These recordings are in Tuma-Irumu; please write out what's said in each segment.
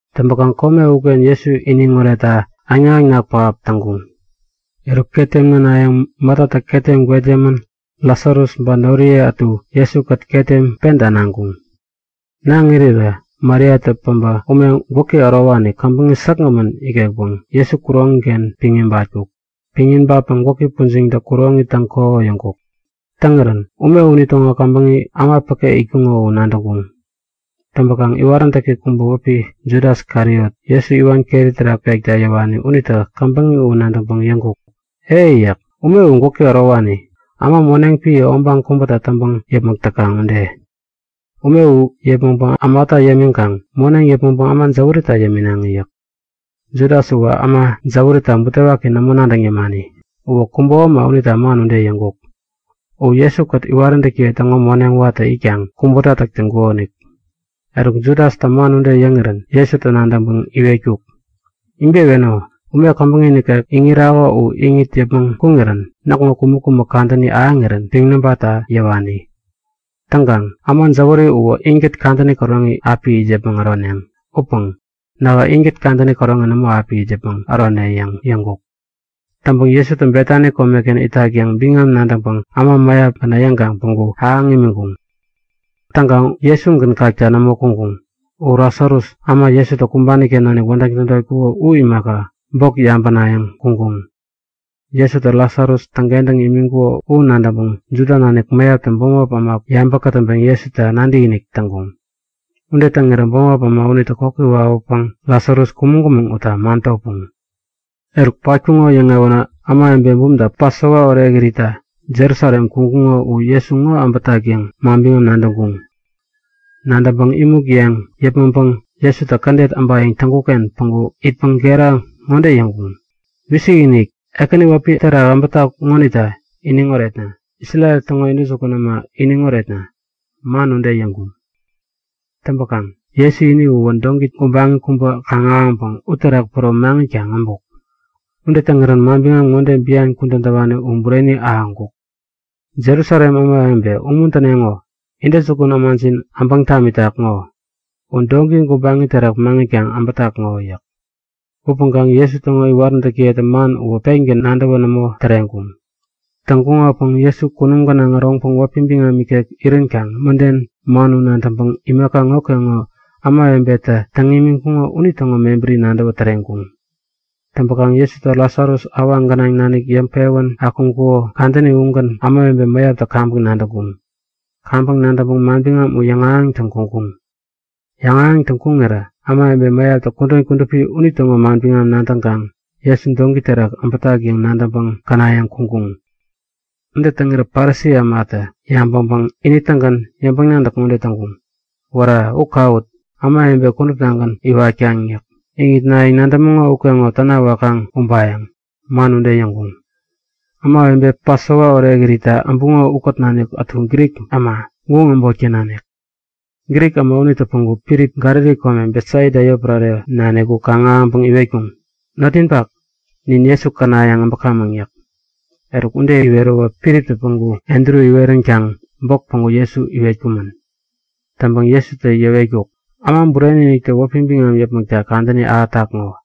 Täŋpäkaŋ kome uken Jesu iniŋ oretta äŋnak-äŋnak pähap täŋkuŋ. Eruk ketem nänayäŋ Matatä ketem gwet yämän Lasarus ba noriye ätukät Jesukät ketem penta naŋkuŋ. Naŋ irirä Mariatä päbä ume gwäki ärowani, käbäŋi säkgämän ikekpäŋ Jesu kuroŋi-ken piŋ ibatkuk. Piŋ ibatpäŋ gwäki pujiŋpäŋ kuroŋi täŋ-kohoyäŋkuk. Täŋirän ume unitäŋo käbäŋi äma päke itkuŋo u nadäŋkuŋ. Täŋpäkaŋ, iwaräntäki kubä wäpi Judas Kariot, Jesu iwan keri terak pekta yäwani unitä käbäŋi u nadäŋpäŋ yäŋkuk; E! Ume u gwäki ärowani, äma moneŋ epän obaŋ kubäta täŋpäŋ yäpmäk täkaŋ ude. Ume u yäpmäŋpäŋ ämata yämiŋkaŋ moneŋ yäpmäŋpäŋ äma jäwärita yäminaŋi yäk. Judas uwä äma jäwärita butewaki nämo nadäŋ yämani. Uwä kubo äma unita man ude yäŋkuk. U Jesu-kät iwaräntäkiye täŋo moneŋ watä itkaŋ kubota täk täŋkukonik. Eruk, Judastä man ude yäŋirän Jesutä nadäŋpäŋ iwetkuk; Ibeweno! Ume käbäŋi nikek iŋirako u iŋit yäpmäŋ kuŋirän näkŋo kumäk-kumäk kadäni ahäŋirän piŋ nabatta yäwani. Täŋkaŋ äma jäwäri uwä inkät kadäni käroŋi api it yäpmäŋ äroneŋ. Upäŋkaŋ nähä inkät kadäni käroŋi nämo api it yäpmäŋ ärone yäŋ yäŋkuk. Täŋpäkaŋ Jesu Betani komeken itak yäŋ biŋam nadäŋpäŋ äma mäyap käna yäŋkaŋ päŋku ahäŋ imiŋkuŋ. Täŋkaŋ Jesugän kakta nämo kuŋkuŋ. U Lasarus, äma Jesutä kumbani-ken nanik wädäŋ tädotkuko u imaka, bok yabänayäŋ kuŋkuŋ. Jesutä Lasarus täŋkentäŋ imiŋkuko u nadäŋpäŋ Juda nanik mäyaptä bämop äma yabä kätäŋpeŋ Jesuta nadäkinik täŋkuŋ. Ude täŋirä bämop äma unitä kokwawak nadäŋpäŋ Lasarus kumäŋ-kumäŋ utta man topuŋ. Eruk, patkuŋo yäŋewänä ämawebe bumta Pasova Orekiritta Jerusalem kuŋkuŋo u Jesu ŋo äbätak yäŋ manbiŋam nadäŋkuŋ. Nadäŋpäŋ imuk yeŋ yäpmäŋpäŋ Jesutä kädet äbayäŋ täŋkuk-ken päŋku itpäŋ gera ŋode yäŋkuŋ; Wisikinik! Ekäni wäpi terak äbätak ŋonita iniŋ oretna! Isrel täŋo intäjukun äma iniŋ oretna! Man ude yäŋkuŋ. Täŋpäkaŋ Jesu ini uwä doŋki gubaŋi kubä kaŋ-ahäŋpäŋ uterak päro maŋitkaŋ äbuk. Ude täŋirän manbiŋam ŋode bian kudän täwani u bureni ahäŋkuk; Jerusalem ämawebe, umuntäneŋo! Intäjukun ämajin äbäŋ tamitak ŋo. U doŋki gubaŋi terak maŋitkaŋ äbätak ŋo! yäk. Man ude kudän täwani pätkaŋ Jesu täŋo iwaräntäkiyetä man uwä pengän nadäwä nämo täreŋkuŋ. Täŋkuŋopäŋ Jesu kunum gänaŋ äroŋpäŋ wäpi biŋam ikek iränkaŋ mäden man u nadäŋpäŋ imaka ŋokeŋo ämawebetä täŋ imiŋkuŋo unitäŋo mebäri nadäwä täreŋkuŋ. Täŋpäkaŋ Jesutä Lasarus awaŋ gänaŋ nanik yäŋpewän akuŋkuko kadäni ugän ämawebe mäyaptä kaŋpäŋ nadäŋkuŋ. Kaŋpäŋ nadäŋkaŋ manbiŋam u yäŋahäŋtäŋ kuŋkuŋ. Yäŋahäŋtäŋ kuŋirä ämawebe mäyaptä kudän kudupi unitäŋo manbiŋam nadäŋkaŋ Jesu doŋki terak äbätak yäŋ nadäŋpäŋ känayäŋ kuŋkuŋ. Ude täŋirä Parisi ämatä yabäŋpäŋ ini-tägän yäŋpäŋ-nadäk ŋode täŋkuŋ; Wära, u kawut! Ämawebe kuduptagän iwatkaŋ yäk. Iŋitnayäŋ nadämäŋo ukeŋo täna wakaŋ ubayäŋ. Man ude yäŋkuŋ. Ämawebe Pasova Orekiritta äbuŋo ukät nanik ätu Grik äma, guŋ äbotken nanik. Grik äma unitä päŋku Filip, Galili kome, Betsaida yotpärareken nanik u kaŋ-ahäŋpäŋ iwetkuŋ; Notninpak, nin Jesu känayäŋ äbäkamäŋ yäk. Eruk, ude iweräwä Filiptä päŋku Andru iweränkaŋ bok päŋku Jesu iwetkumän. Täŋpäŋ Jesutä yäwetkuk; Äma Bureni-iniktä wäpi biŋam yäpmäkta kadäni ahätak ŋo.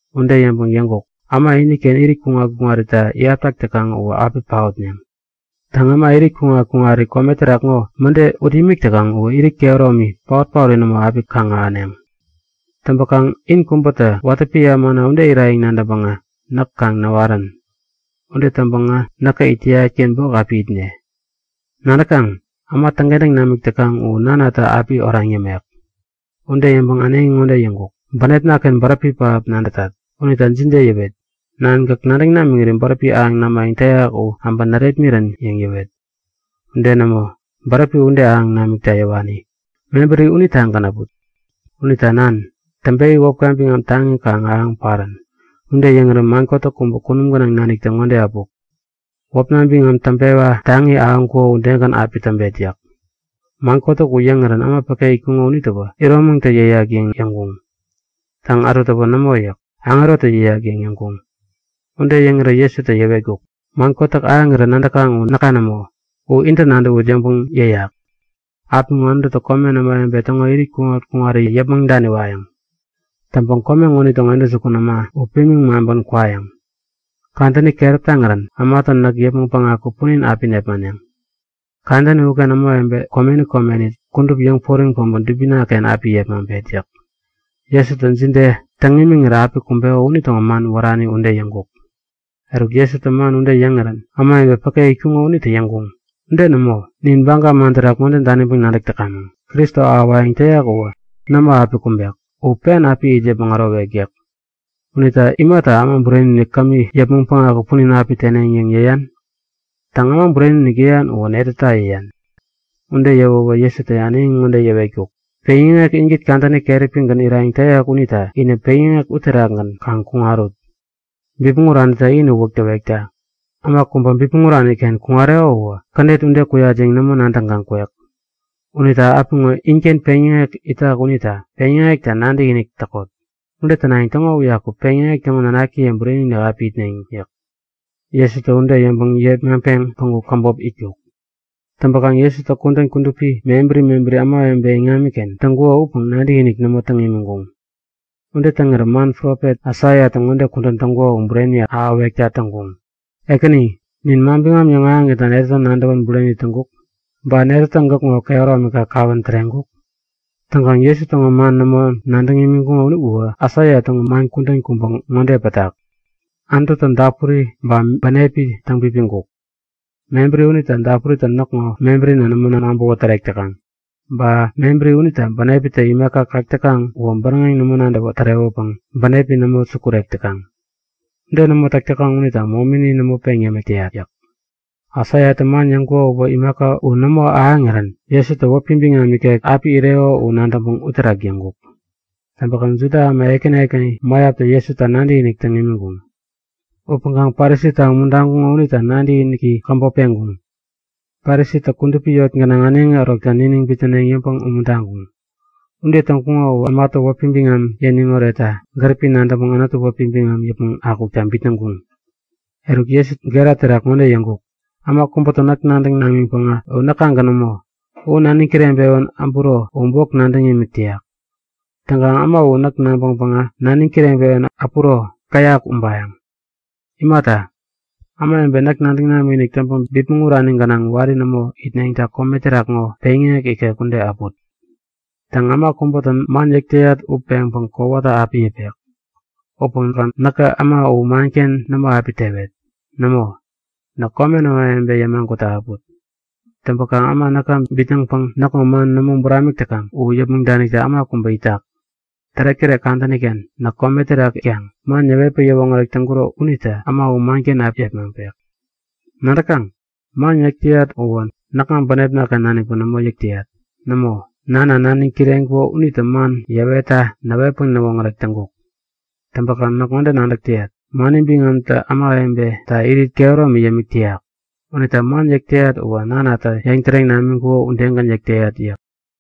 Ude yäŋpäŋ yäŋkuk; U udegän äma iniken irit kuŋat-kuŋarita iyaptak täkaŋ uwä api paotneŋ. Täŋ, äma irit kuŋat-kuŋari kome terak ŋo mäde ut imik täkaŋ uwä irit kehäromi, paot-paori nämo u api kaŋ-ahäneŋ. Täŋpäkaŋ in kubätä watä epän ämana ude irayäŋ nadäŋpäŋä näk kaŋ näwarän. Ude täŋpäŋä näkä it täyat-ken bok api itde. Nadäkaŋ? Äma täŋkentäŋ namik täkaŋ u Nanatä api oraŋ yämek. Ude yäŋpäŋ äneŋi ŋode yäŋkuk; Bänepna-ken bäräpi pähap nadätat. Unita jide yäwet? Nan, gäk nadäŋ namiŋiri bäräpi ahäŋ namayäŋ täyak u äbä närepmirän yäŋ yäwet? Ude nämo, bäräpi ude ahäŋ namikta yäwani. Mebäri udetagän äput. Unita Nan, täŋpewi wäpka biŋam taŋi kaŋ ahäŋ parän! Ude yäŋirän man kotäk kubä kunum gänaŋ naniktä ŋode äpuk; Wäpna biŋam täŋpewa taŋi ahäŋkuko udegän api täŋpet yäk. Man kotäk ude yäŋirän äma päke itkuŋo unitäwä iromäŋtä yäyak yäŋ yäŋkuŋ. Täŋ ätutäwä Nämo yäk. Aŋerotä yäyak yäŋ yäŋkuŋ. Ude yäŋirä Jesutä yäwetkuk; Man kotäk ahäŋirän nadäkaŋ u näka nämo. U intä nadäwut yäŋpäŋ yäyak. Apiŋo Anututä komen ämawebe täŋo irit kuŋat-kuŋari yäpmäŋ daniwayäŋ. Täŋpäŋ kome ŋonitäŋo intäjukun äma u pimiŋ maŋpän kwayäŋ. Kadäni keräp taŋirän ämatä näk yäpmäŋ päŋaku punin api nepmaneŋ. Kadäni uken ämawebe komeni komeni kudup yäŋporiŋ päbä dubina-kengän api yepmaŋpet yäk. Jesutä jide täŋ imiŋirä api kumbeko unitäŋo man wärani ude yäŋkuk. Eruk, Jesutä man ude yäŋirän ämawebe päke itkuŋo unitä yäŋkuŋ; Ude nämo. Nin Baga man terak ŋode daniŋpäŋ nadäk täkamäŋ; Kristo ahäwayäŋ täyak uwä nämo api kumbek. U pen api it yäpmäŋ ärowek yäk. Unita imata Äma Bureni-inik kämi yäpmäŋ päŋaku punin api teneŋ yäŋ yäyan? E, Äma Bureni-inik yäyan uwä netäta yäyan? Ude yäwäwä Jesutä äneŋi ŋode yäwetkuk; Peŋyäŋek inkät kadäni keräpigän irayäŋ täyak unita inä peŋyäŋek uterakgän kaŋ kuŋarut. Bipmäŋ uranitä in uwäk täwekta. Äma kubä bipmäŋ urani-ken kuŋareko uwä kädet ude kuyat yäŋ nämo nadäŋkaŋ kwek. Unita apiŋo inken peŋyäŋek itak unita peŋyäŋekta nadäkinik täkot. Ude tänayäŋ täŋo uyaku peŋyäŋek täŋo nanakiye bureni api itneŋ yäk. Jesutä ude yäŋpäŋ yepmaŋpeŋ päŋku käbop itkuk. Täŋpäkaŋ Jesutä kudän kudupi mebäri mebäri ämawebe iŋamiken täŋkuko upäŋkaŋ nadäkinik nämo täŋ imiŋkuŋ. Ude täŋirä man profet Aisaiatä ŋode kudän täŋkuko u bureni ahäwekta täŋkuŋ; Ekäni, nin manbiŋam yäŋahäŋitna netätä nadäwän bureni täŋkuk? Ba netätä gäkŋo kehäromika kawän täreŋkuk? Täŋkaŋ Jesu täŋo man nämo nadäŋ imiŋkuŋo uwä Aisaia täŋo man kudän kubä ŋode pätak; Anututä dapuri ba bänepi täŋpipiŋkuk. Mebäri unita, dapuritä näkŋo mebärina nämo nabäwä tärek täkaŋ. Ba mebäri unita bänepitä imaka kak täkaŋ uwä bäräŋeŋ nämo nadäwä tärewäpäŋ bänepi nämo sukurek täkaŋ. Ude nämo täk täkaŋ unita momini nämo peŋ yämik täyat yäk. Aisaiatä man yäŋkuko uwä, imaka u nämo ahäŋirän Jesutä wäpi biŋam ikek api ireko u nadäŋpäŋ uterak yäŋkuk. Täŋpäkaŋ Juda äma ekäni ekäni mäyaptä Jesuta nadäkinik täŋ imiŋkuŋ. Upäŋkaŋ Parisita umuntaŋkuŋo unita nadäkiniki käbop peŋkuŋ. Parisitä kudupi eŋi gänaŋ äneŋi ärokta niniŋ bitnäneŋ yäŋpäŋ umuntaŋkuŋ. Ude täŋkuŋo uwä ämatä wäpi biŋam yäniŋ oretta gäripi nadäŋpäŋ Anututä wäpi biŋam yäpmäŋ akukta bitnäŋkuŋ. Eruk, Jesutä gera terak ŋode yäŋkuk; Äma kubätä näk nadäŋ namiŋpäŋä uwä näkagän nämo. U naniŋ kireŋpewän äburo u bok nadäŋ imik täyak. Täŋkaŋ äma u näk nabäŋpäŋä naniŋ kireŋpewän äpuro käyak ubayäŋ. Imata, ämawebe näk nadäŋ namikinik täŋpäŋ bipmäŋ urani gänaŋ wari nämo itneŋta kome terak ŋo peŋyäŋek ikek ude äput. Täŋ, äma kubätä man yäk täyat u peŋpäŋ kowata api yäpek. Upäŋkaŋ näkä äma u manken nämo api tewet. Nämo, näk komen ämawebe yämagutta äput. Täŋpäkaŋ äma näka bitnäŋpäŋ näkŋo man nämo buramik täkaŋ u yäpmäŋ danikta äma kubä itak. Tärektärek kadäni-ken näk kome terak itkaŋ man yäwetpäŋ yäwoŋärek täŋkuro unitä äma u manken api yepmaŋpek. Nadäkaŋ? Man yäk yäyat uwä näkŋa bänepna-ken nanikpäŋ nämo yäk täyat. Nämo, Nana naniŋ kireŋkuko unitä man yäŋahäwetta näwetpäŋ näwoŋärek täŋkuk. Täŋpäkaŋ näk ŋode nadäk täyat; Mani biŋamtä ämawebeta irit kehäromi yämik täyak. Unita man yäk täyat uwä Nanatä yäŋtäreŋ namiŋkuko udegän yäk täyat yäk.